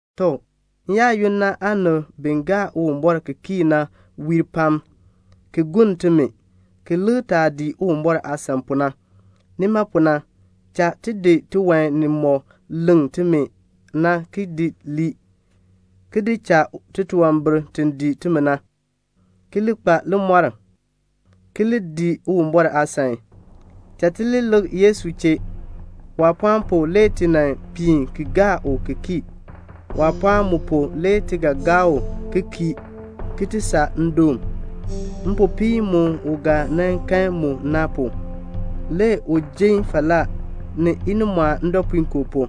Tɔ, n-yaayoonn na aanib bi gaa Uwumbɔr ki kii na wiir pam, ki gonn timi, ki lik taah dii Uwumbɔr aasan pu na. Nima pu na, cha ti di tiwan nimɔk leŋ timi na ki di lii, ki di cha titunwambir ti dii timi na, ki li kpa limɔr, ki li dii Uwumbɔr aasan. Cha ti li lik Yesu chee. Waapɔɔn pu le ti nan piin ki gaa u ki kii. Waapɔɔn mu pu le ti ga gaa u ki kii ki ti saa ndoon. Mpopiin mu u ga nan kan mu na pu, le u jin falaa ni inimɔɔn ndɔpuinkoo pu,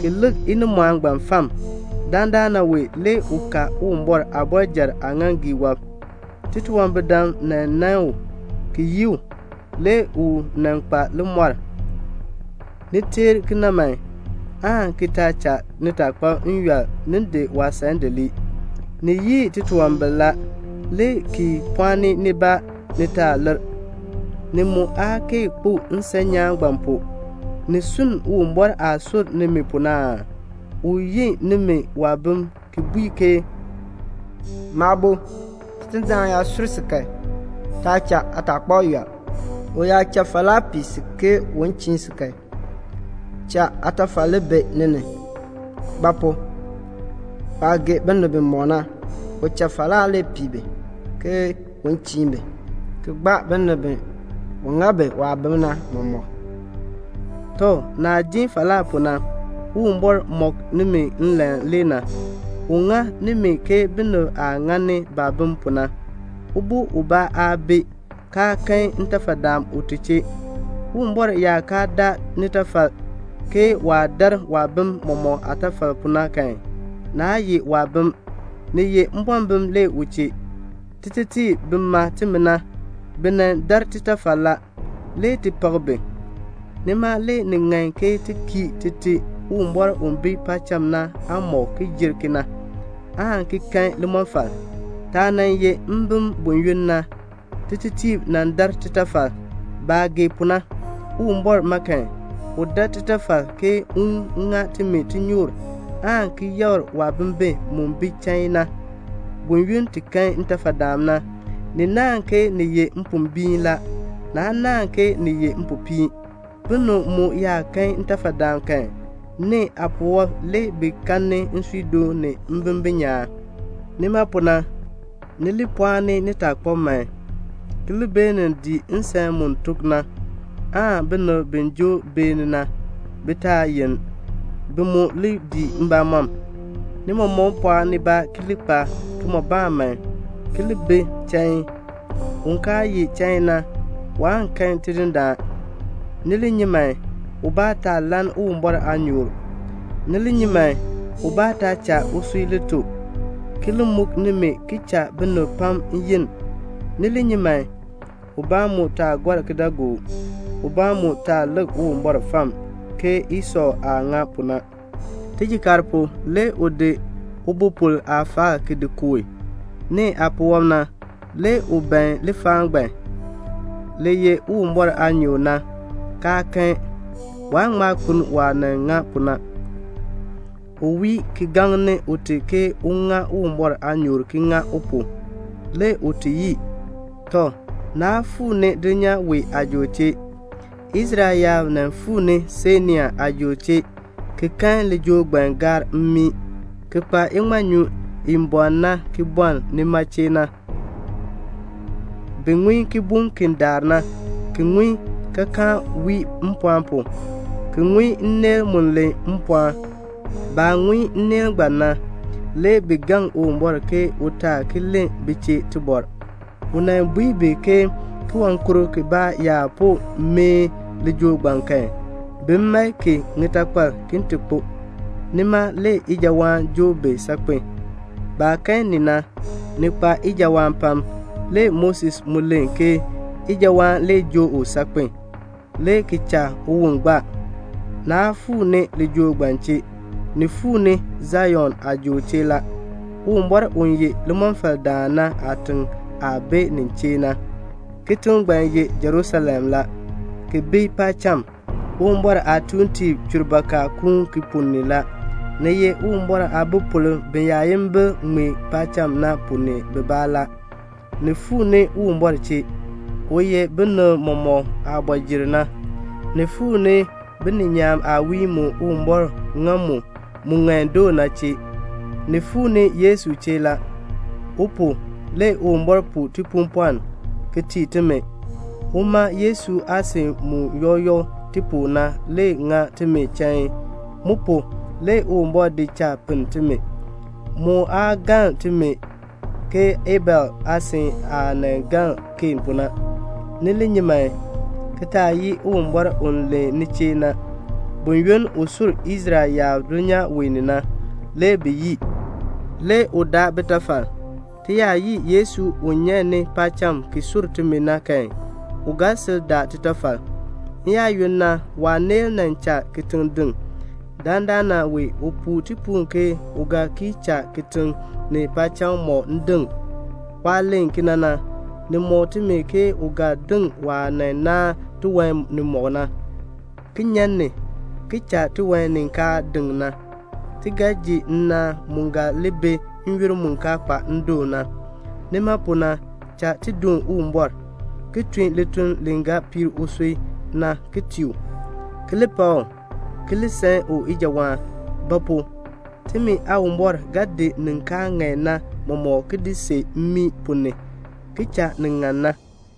ki lik inimɔɔn ngbaan fam. Dandana wee le u ka Uwumbɔr aabɔrjal aaŋaaŋgii wɔb. Titunwambirdam nan nan u, ki yii u. Le u nan kpa limɔr. Ni teer kena man, aan ki taa cha nitaakpab yɔl ni di waasan di lii. Ni yii titunwambir la, le ki pɔɔni nibaa ni taa lir; ni mu aa kee kpo nsan nyaan ngbaan pu. Ni sunn Uwumbɔr aah sur nimi pu na aa? U yi nimi waabim ki bui ke "Maabo, Tidindaan yaa sur si kan, taa cha aataakpab yɔl. U yaa cha falaa pii si ke un chiin si kan, cha aatafal li bi ni ni. Ba pu? waah gee binib bimɔk na, u cha falaa le pii bi ke un chiin bi, ki gbaa binib bi u ŋa bi waabim na mɔmɔk." Tɔ, naah ji falaa pu na, Uwumbɔr mɔk nimi nlan le na. U ŋa nimi ke binib aah ŋani baabim pu na. Ubo ubaa aa bi, kaa kan ntafadaan ute chee. Uwumbɔr yaa kaa daa nitafal, ke waah dar waabim mɔmɔk aatafal pu na kan, naa ye waabim, ni ye mbɔmbim le u chee. Titetiib bi ma timi na, bi nan dar titafal la, le ti pak bi. Nima le ni ŋan ke ti kii Tite Uwumbɔr u bi paacham na aamɔb ki jer kena, aan ki kan limɔfal. Taah nan ye mbim buyoonn na, titetiib nan dar titafal, baah gee pu na. Uwumbɔr ma kan, u dar titafal ke un ŋa timi tinyoor, aan ti yakr waabimbin mu bi chain na. Buyoonn ti kan ntafadaan na, ni naahn ke ni ye mpombiin la, naa naahn ke ni ye mpopiin. Binib mu yaa kan ntafadaan kan, nee aapuwɔb le bi kan nsuudoon ni mbimbin nyaan. Nima pu na, ni li pɔɔni nitaakpab man, ki li beenin dii nsan mu tok na, aan binib bi joo beeni na, bi taa yenn; bi mu li dii mbamɔm. Ni mɔmɔk pɔɔ nibaa ki li kpa kimɔbaan man, ki li bi chain. Un kaa ye chain na, waan kan Tidindaan. Ni li nyi man, ubaa taa lann Uwumbɔr aanyoor. Ni li nyi man, ubaa taa cha usui li to ki li muk nimi ki cha binib pam yenn. Ni li nyi man, ubaa mu taa gɔr kidaagook. Ubaa mu taa lik Uwumbɔr fam ke Esɔ aah ŋa pu na. Tijikaar pu, le u di ubopol aafaal ki di kooh. Nee aapuwɔb na, le u ban lifaal ngbaan, li ye Uwumbɔr aanyoor na, kaa kan. Waa ŋma kpeln waah nan ŋa pu na. U wii ki gaŋni ute ke un ŋa Uwumbɔr aanyoor ki ŋa u pu. Le ute yii. Tɔ, naa fuu ni dulnyaa wee aajool chee. Israel yaab nan fuu ni Sainai aajool chee, ki kan lijool ngbaan gaar mmii ki kpa iŋmanyu i bɔɔn na ki bɔln nima chee na. Bi ŋun kibuŋ ki daar na, ki ŋun kaakaan wii mpɔɔn pu, ki ŋun nneel mu len mpɔɔn. Baah ŋun nneel ngbaan na, le bi gaŋ Uwumbɔr ke u taa ki len bi chee tibɔr. U nan bui bi ke kiwankurk kibaa yaa po meeh lijool ngbaan kan, bin mae ki ŋitakpal ki ti kpo. Nima le ijawaan joo bi saakpen a. Baah kan ni na, ni kpa ijawaan pam. Le Moses mu len ke ijawaan le joo u saakpen, le ki cha uwon gbaa. Naa fuu ni lijool ngbaan chee. Ni fuu ni Sion aajool chee la, Uwumbɔr u ye limɔfaldaan na aatiŋ aah bi nin chee na. Kitiŋ ngbaan ye Jerusalem la, ki bi paacham. Uwumbɔr aatuuntiib chur baka kuun ki ponn ni la. Ni ye Uwumbɔr aabipolb biyaayimbil ŋmee paacham na ponn ni bibaa la. Ni fuu ni Uwumbɔr chee, u ye binib mɔmɔk aabɔjir na. Ni fuu ni bininyaan aawiin mu Uwumbɔr ŋa mu, mu ŋan doo na chee. Ni fuu ni Yesu chee la. U pu, le Uwumbɔr puu tipuupɔln ki tii timi. Uma Yesu aasin mu yɔk yɔk ti pu na le ŋa timi chain. Mu pu, le Uwumbɔr di cha pinn timi. Mu aa galn timi ke Abel aasin aah nan galn Keen pu na. Ni li nyi man, ki taa yii Uwumbɔr u len ni chee na. Buyoonn u sur Israel yaab dulnyaa wee ni na, le bi yii, le u daa bitafal. Ti yaa yii Yesu u nyan ni paacham ki sur timi na kan, u ga sil daa titafal. N-yaayoonn na waaneel nan cha kitiŋ deŋ. Dandana wee u puu tipuul ke u ga ki cha kitiŋ ni paacham mɔk deŋ. Waah len kena na, ni mɔk timi ke u ga deŋ waah nan naan tiwan nimɔk na, ki nyan ni, ki cha tiwan ni kaan deŋ na. Ti ga ji nnaan mu ga li bi n-yoonn mu kaa kpa ndoon na. Nima pu na cha ti doon Uwumbɔr, ki tun lituln li ga piir usui na ki tii u, ki li pak u, ki li san u ijawaan. Ba pu? timi Aawumbɔr ga di nin kaa ŋan na mɔmɔk ki di see mmii ponn ni, ki cha nin ŋan na.